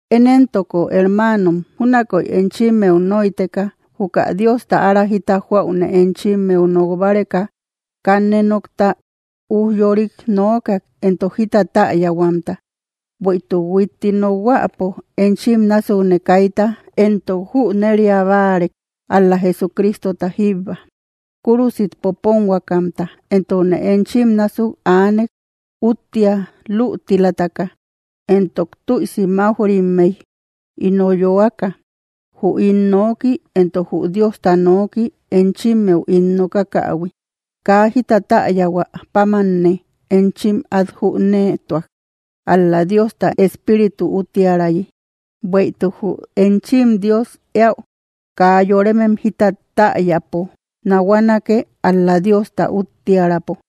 Én éntoko, hermanom, júnakoy enchimmeu noïteka juka Diosta ára jita joaune enchimmeu nok báreka, kanne nokta ujyorik nokak entok jita taayahuamta. Bueïtuk huitti nokhuäpo enchim násukne, kayta entok jüneriabáarek ál‑la Jesucristota jíbba, kúrusit poponhuakamta. Entokne enchim násuk aanek úttia lútilataka, entok tuïsi maujrimey ino yöaka; jü ín noki entok jü Diosta nooki enchimmeu ín nokakähui, kaa jita täyahua pámanne enchim át jünetuak, ál‑la Diosta Espíritu úttiärayi, bueïtuk jü enchim Dios eaü kaa yoremem jita täyäpo nahuanake, ál‑la Diosta úttiaräpo.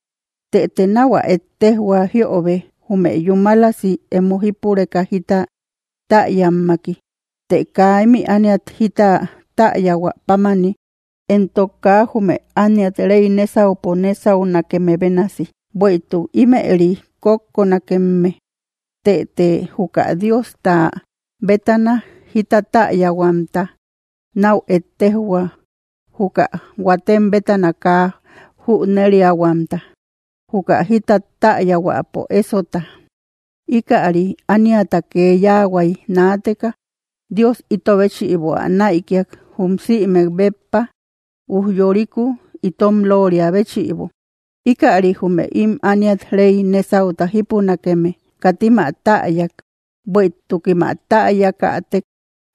Tëte nau ä ettejhua jiobe, jume yúmalasi emo jípureka jita täyammaki, të kaa imi ániat jita taayahua pámani, entok kaa jume ániat rey nesaupo nesaunakeme bénasi, bueïtuk imëri kókkonakemme. Tëte juka Diosta bétana jita täyahuamta nau ettejjo, juka huatem bétana kaa jüneriahuamta, juka jita täyahuäpo esota, ikäri, ániata kee yahuay náateka Dios ito béchïbo, ä naïkiak, jum sïmek béppa ujyoriku itom looria béchïbo. Ikäri jume im ániat rey nesauta jípunakeme katim ä täyak, bueïtukim ä täyakatek,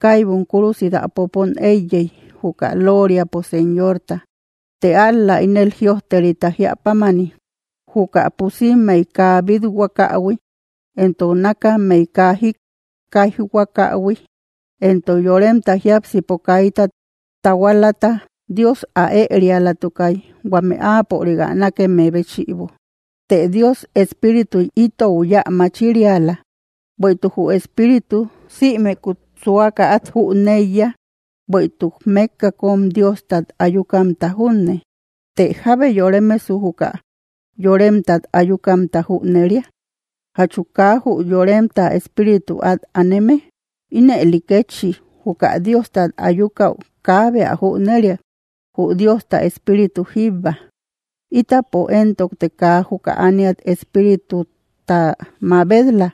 kaibum kúrusit ä popon eiyey, juka looriapo Señorta. Të ál‑la ínel jïojterita jiä pámani: Juka pusimmeï kaa bit‑huakähui, entok nakammey kaa jikkaijhuakahui, entok yoremta jiápsipo kaita tahualata, Dios ä erialatukay huame áapörik ä nakeme béchïbo. Të Dios, Espírituy ítou yeu ä mächiriala; bueïtuk jü Espíritu sïmekut suaka át jüneiya, bueïtuk mekka kom Diostat ayukamta junne. ¿Tëe jábe yoremesu, juka yoremtat ayukamta jüneria? ¿Jachu kaa jü yoremta espíritu at aneme? Ínëli kétchi juka Diostat ayukau kaabe ä jüneriak, jü Diosta Espíritu jíbba. Ítapo entokte kaa juka ániat espírituta mabet‑la,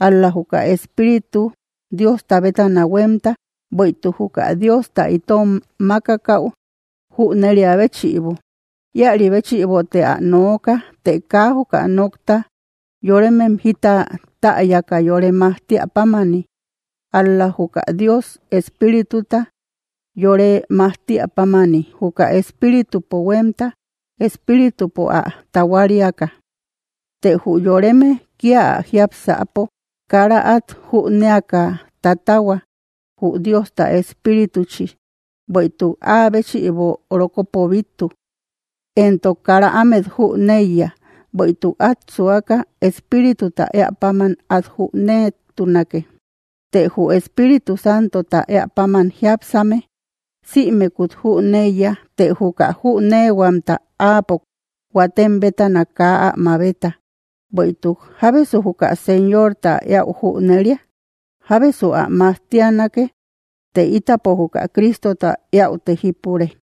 ál‑la juka Espíritu Diosta bétana huemta, bueïtuk juka Diosta itom makakau jüneria béchïbo. Ïaribéchïbote ä nooka të kaa juka nokta yoremem jita täyaka yore majtia pámani, ál‑la juka Dios Espírituta yore majtia pámani, juka Espíritupo huemta Espíritupo ä tahuariaka. Të jü yoreme kia ä jiápsapo kara at jünéaka tatahua jü Diosta espirituchi, bueïtuk áa béchïbo rokopo bittu. Entok kara ámet jüneiya, bueïtuk at suaka Espírituta eäpam át jünetunake. Të jü Espíritu Santota eäpáman jiápsame sïmekut jüneiya, të juka jünehuamta áapo huatem bétana kaa ä mabeta. Bueïtuk: “¿Jábesu juka Señorta eäu jüneriak? ¿Jábesu ä majtianake?” Të ítapo juka Cristota eäute jípure.